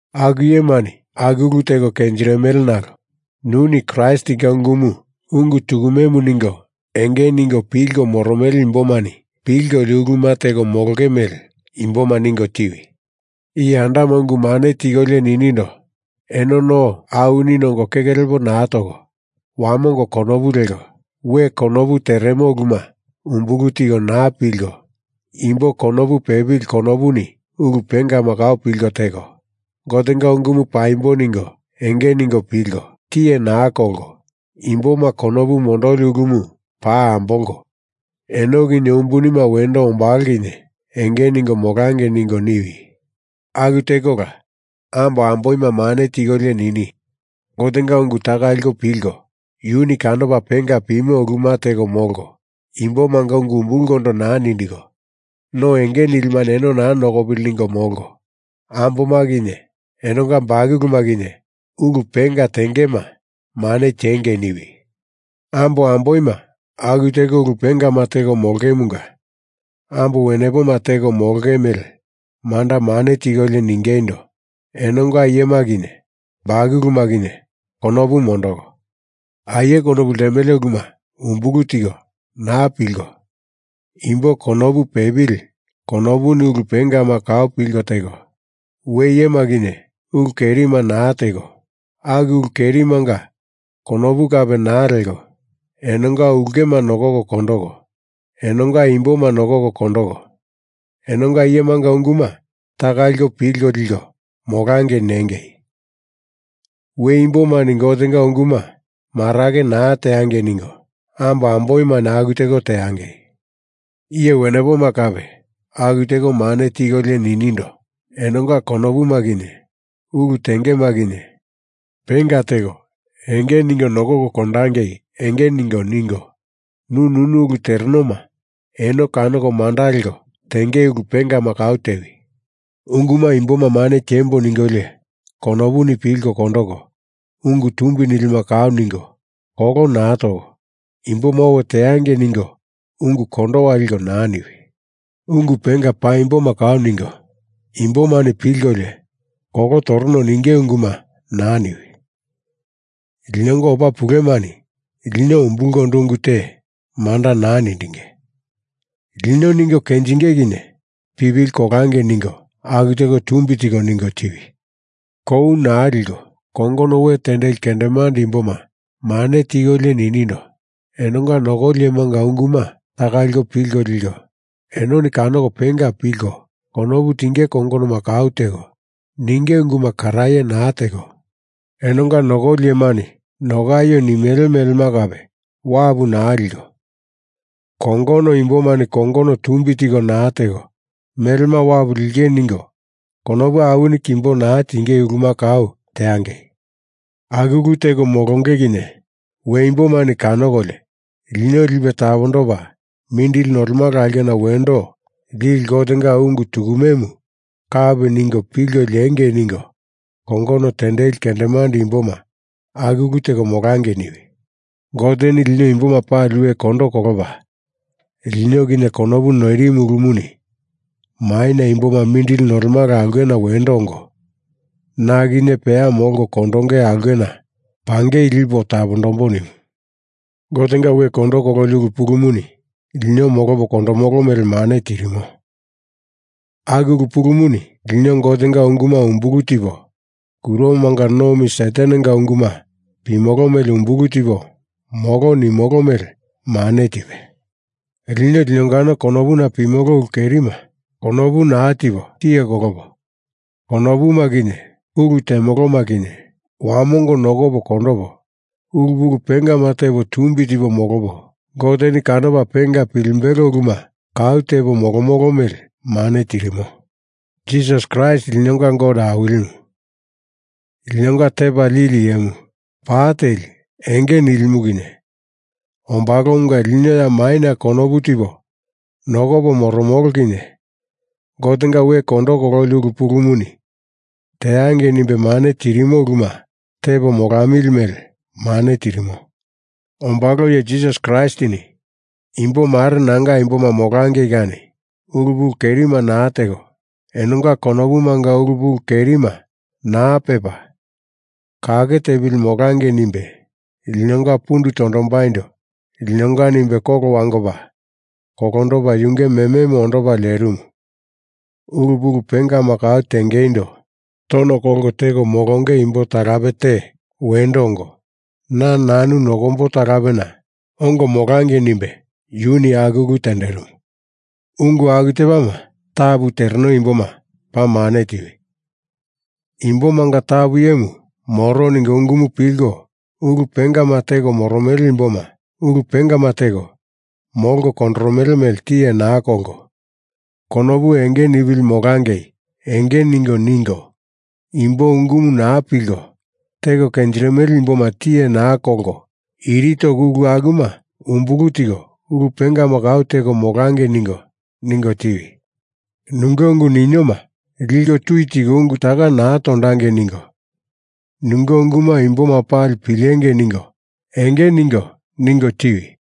Aku iyemani aku ulu teko kenjirimele nalo nuni Kraistinga ungumu ungu tukumemu ningo enge ningo pilko moromele imbomani pilkolio uluma teko molonge mele imboma ningo tiwi. Iye andama ungu mane tikolio ninindo, eno no awini nongo keke lepo naa toko, wamongo konopu leko, we konopu teremo uluma umbulu tiko naa pilko imbo konopu pepili konopuni ulu pengama kau pilko teko, Gotenga ungumu paimbo ningo enge ningo pilko, tiye naa kolko, imboma konopu mondoli ulumu paa ambolko, eno kinye umbunima wendo ombalo kinye enge ningo molangei ningo niwi. Aku tekola ambo amboima mane tikolio nini, Gotenga unguma taka liko pilko yuni kanopa penga pimo uluma teko molko, imbomanga ungu umbulkondo naa nindiko, no enge nilimani eno naa nokopili ningo molko, amboma kinye enonga bakuluma kinye ulu penga tengema mane tiengei niwi. Ambo amboima aku teko ulu pengama teko molongemunga ambo wenepoma teko molonge mele manda mane tikolio ningeindo, enonga iyema kinye bakuluma kinye konopu mondoko, aie konopu ltemele uluma umbulu tiko naa pilko imbo konopu pepili konopuni ulu pengama kau pilko teko, we iyema kinye ulu kerima naa teko, aku ulu kerimanga konopu kape naa leko, enonga ulkema nokoko kondoko, enonga imboma nokoko kondoko, enonga iyemanga unguma taka liko pilko liko molangei nengei. We imbomani Gotenga unguma marake naa teangei ningo ambo amboimani aku teko teangei. Iye wenepoma kape aku teko mane tikolio ninindo enonga konopuma kinye ulu tengema kinye penga teko enge ningo nokoko kondangei enge ningo ningo, nu nunu ulu terenoma eno kanoko manda leko tenge ulu pengama kau tewi. Unguma imboma mane tiembo ningolio konopuni pilko kondoko ungu tumbi nilima kau ningo kolo naa toko, imboma owe teangei ningo ungu kondowa liko naa niwi. Ungu penga paimboma kau ningo, imbomani pilkolio kolo toromo ninge unguma naa niwi. Linonga opa pulemani lino umbulkondo ungu te manda naa nindinge. Lino ningo kenjinge kinye pipili kolangei ningo aku teko tumbi tiko ningo tiwi. Kou naa liko kongono we tendeli kendemande imboma mane tikolio ninindo, enonga nokoli iyemanga unguma taka liko pilko liko, enoni kanoko penga pilko konopu tinge kongonoma kau teko, ninge unguma karaye naa teko, enonga nokoli iyemani nokaio nimele melema kape wapu naa liko, kongono imbomani kongono tumbi tiko naa teko, melema wapu linge ningo konopu awini kimbo naa tinge uluma kau teangei. Aku ulu teko molonge kinye we imbomani kanokolio lino Lipe Tapondopa Mindili Nolemala Aulkena Wendo Lili Gotenga ungu tukumemu kapi ningo pilko liengei ningo kongono tendeli kendemande imboma aku ulu teko molangei niwi. Goteni lino imboma pali we kondo kolopa lino kinye konopu noirimu ulumuni maina imboma mindili nolemala aulkena wendo ongo, na kinye peya molko kondonge aulkena pangei lipo tapondambo nimu. Gotenga we kondo kololi ulu pulumuni lino molopo kondomolo mele mane tirimo. Aku ulu pulumuni lino Gotenga unguma umbulu tipo kuromanga nomi Satanenga unguma pimolo mele umbulu tipo molo nimolo mele mane tipe, lino linongano konopuna pimolo ulu kerima konopu naa tipo tiye kolopo, konopuma kinye ulu temoloma kinye wamongo nokopo kondopo, ulu pulu pengama tepo tumbi tipo molopo Goteni kanopa penga pilimbelo uluma kau tepo molomolo mele mane tirimo. Jisas Kraist linonga Gote Awilimu, linonga Tepa Lili Iyemu pa teli enge nilimu kinye ombalomunga lino ya maina konopu tipo nokopo moromolo kinye Gotenga we kondo kololi ulu pulumuni teangei nimbe mane tirimo uluma tepo molamili mele mane tirimo. Ombalo iye Jisas Kraistini imbo mare nanga imboma molangei kani ulu pulu kerima naa teko, enonga konopumanga ulu pulu kerima naa pepa kake tepili molangei nimbe linonga pundu tondombaindo linonga nimbe kolo wangopa kolondopa yunge mememu ondopa lerimu ulu pulu pengama kau tengeindo tono kolko teko molonge imbo talape te wendo ongo, na nanu nokombo talapena ongo molangei nimbe yuni aku ulu tenderimu. Ungu aku tepama tapu tereno imboma paa mane tiwi. Imbomanga tapu iyemu moro ningo ungumu pilko ulu pengama teko moromele imboma ulu pengama teko molko kondoromele mele tiye naa kolko konopu enge nipili molangei enge ningo ningo imbo ungumu naa pilko teko kenjirimele imboma tiye naa kolko iri toko ulu akuma umbulu tiko ulu pengama kau teko molangei ningo ningo tiwi. Nunge ungu ninioma liko tui tiko ungu taka naa tondangei ningo nunge unguma imboma pali pilengei ningo enge ningo ningo tiwi.